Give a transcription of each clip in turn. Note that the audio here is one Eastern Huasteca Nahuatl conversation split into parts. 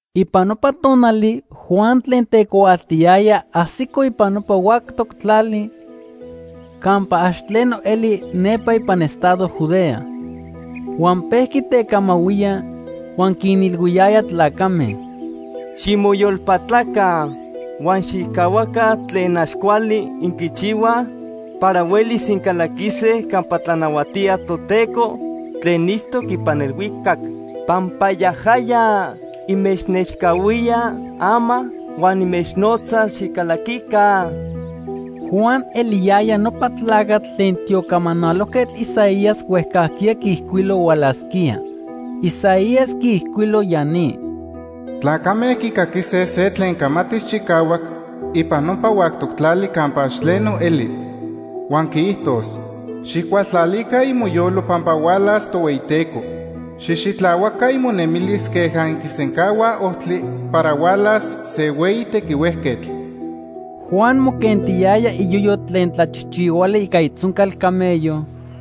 Ipan nopa tonali Juan tlen tecuaaltiyaya ajsico ipan nopa huactoc tlali campa ax tleno eli nepa ipan estado Judea. Huan pejqui tecamahuía, huan quinilhuiyaya tlacame: “Ximoyolpatlaca huan xijcahuaca tlen ax cuali inquichihuaj para huelis incalaquise campa tlanahuatía Toteco tlen itztoc ipan elhuicac, pampa yajaya inmechnechcahuía ama huan inmechnotza xicalaquica.” Juan eliyaya nopa tlacatl tlen tiocamanalojquetl Isaías huejcajquiya quiijcuilo hualasquía. Isaías quiijcuilo ya ni: “Tlacame quicaquise se tlen camatis chicahuac ipan nopa huactoc tlali campa ax tleno eli. Huan quiijtos: ‘Xijcualtlalica imoyolo pampa hualas Tohueyiteco. Xijxitlahuaca imonemilis queja inquisencahuaj ojtli para hualas se hueyi tequihuejquetl.’” Juan moquentiyaya iyoyo tlen tlachijchihuali ica itzoncal camello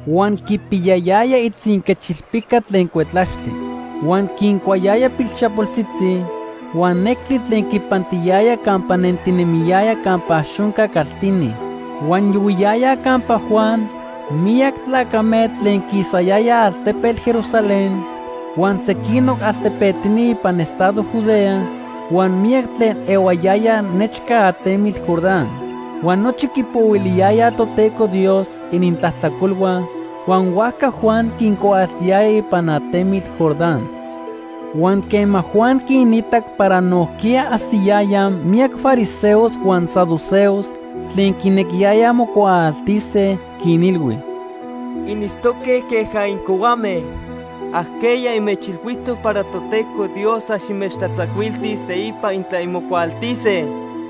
huan quipiyayaya itzinquechilpica tlen cuetlaxtli. Huan quincuayaya pilchapoltzitzi huan nectli tlen quipantiyaya campa nentinemiyaya campa ax onca caltini. Huan yohuiyayaj campa Juan miyac tlacame tlen quisayayaj altepetl Jerusalén huan sequinoc altepetini ipan estado Judea huan miyac tlen ehuayayaj nechca atemitl Jordán. Huan nochi quipohuiliyayaj Toteco Dios inintlajtlacolhua, huan huajca Juan quincuaaltiyaya ipan atemitl Jordán. Huan quema Juan quinitac para nojquiya ajsiyayaj miyac fariseos huan saduceos tlen quinequiyayaj mocuaaltise, quinilhui: “Initztoque queja incohuame. ¿Ajqueya inmechilhuijtoc para Toteco Dios ax inmechtlatzacuiltis teipa intla inmocuaaltise?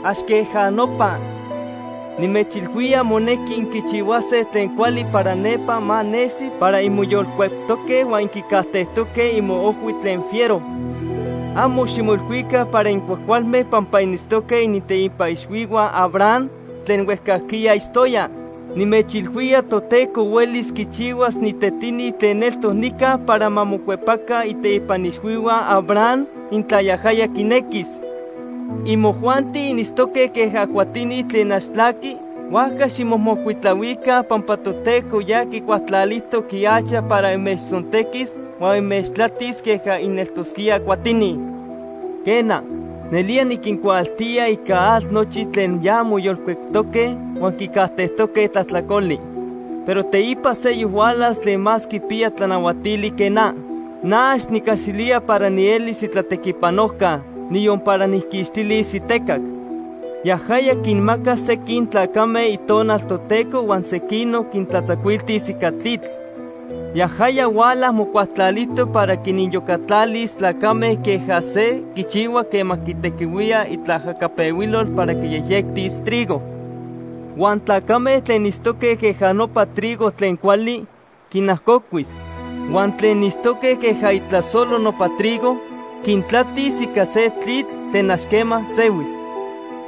Ax queja nopa. Nimechilhuía monequi inquichihuase tlen cuali para nempa ma nesi para inmoyolcueptoque huan inquicajtejtoque imoojhui tlen fiero. Amo ximoilhuica para incuajcualme pampa initztoque initeipa ixhuihua Abraham tlen huejcajquiya itztoya. Nimechilhuía Toteco huelis quichihuas ni tetini tlen eltoc nica para ma mocuepaca iteipa ixhuihua Abraham intla yajaya quinequis. Imojuanti initztoque queja cuatini tlen ax tlaquij, huajca ximomocuitlahuica pampa Toteco ya quicualtlalijtoc ihacha para inmechtzontequis huan inmechtlatis queja ineltosquíaj cuatini. “Quena, nelía niquincuaaltía ica atl nochi tlen ya moyolcueptoque huan quicajtejtoque tlajtlacoli. Pero teipa seyoc hualas tlen más quipiya tlanahuatili que na. Na ax nicaxilía para nielis itlatequipanojca, niyon para nijquixtilis itecac. Yajaya quinmacas sequin tlacame Itonal Toteco huan sequinoc quintlatzacuiltis ica tlitl. Yajaya huala mocualtlalijtoc para quiniyocatlalis tlacame queja se quichihua quema quitequihuía itlaajcapehuilol para quiyejyectis trigo. Huan tlacame tlen itztoque queja nopa trigo tlen cuali, quinajcocuis. Huan tlen itztoque queja itlasolo nopa trigo, quintlatis ica se tlitl tlen ax quema sehuis.”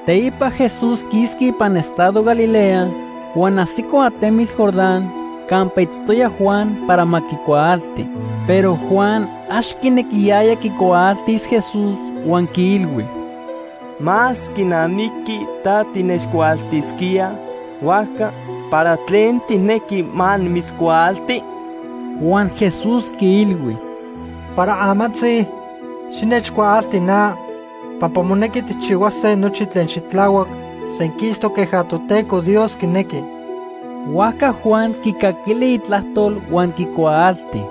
Teipa Jesús quisqui ipan estado Galilea huan ajsico atemitl Jordán campa itztoya Juan para ma quicuaalti. Pero Juan ax quinequiyaya quicuaaltis Jesús huan quiilhui: ―Más quinamiqui ta tinechcuaaltisquía, huajca ¿para tlen tijnequi ma nimitzcuaalti? Huan Jesús quiilhui: ―Para amantzi, xinechcuaalti na pampa monequi tijchihuase nochi tlen xitlahuac senquistoc queja Toteco Dios quinequi. Huajca Juan quicaquili itlajtol huan quicuaalti.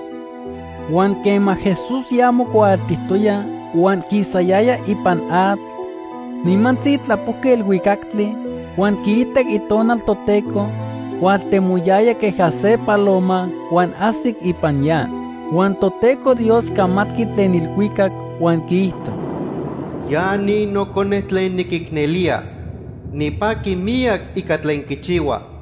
Huan quema Jesús ya mocuaaltijtoya huan quisayaya ipan atl, nimantzi tlapojqui elhuicactli huan quiitac Itonal Toteco hualtemoyaya queja se paloma huan ajsic ipan ya. Huan Toteco Dios camatqui tlen elhuicac huan quiijto: “Ya ni Nocone tlen niquicnelía. Nipaqui miyac ica tlen quichihua.”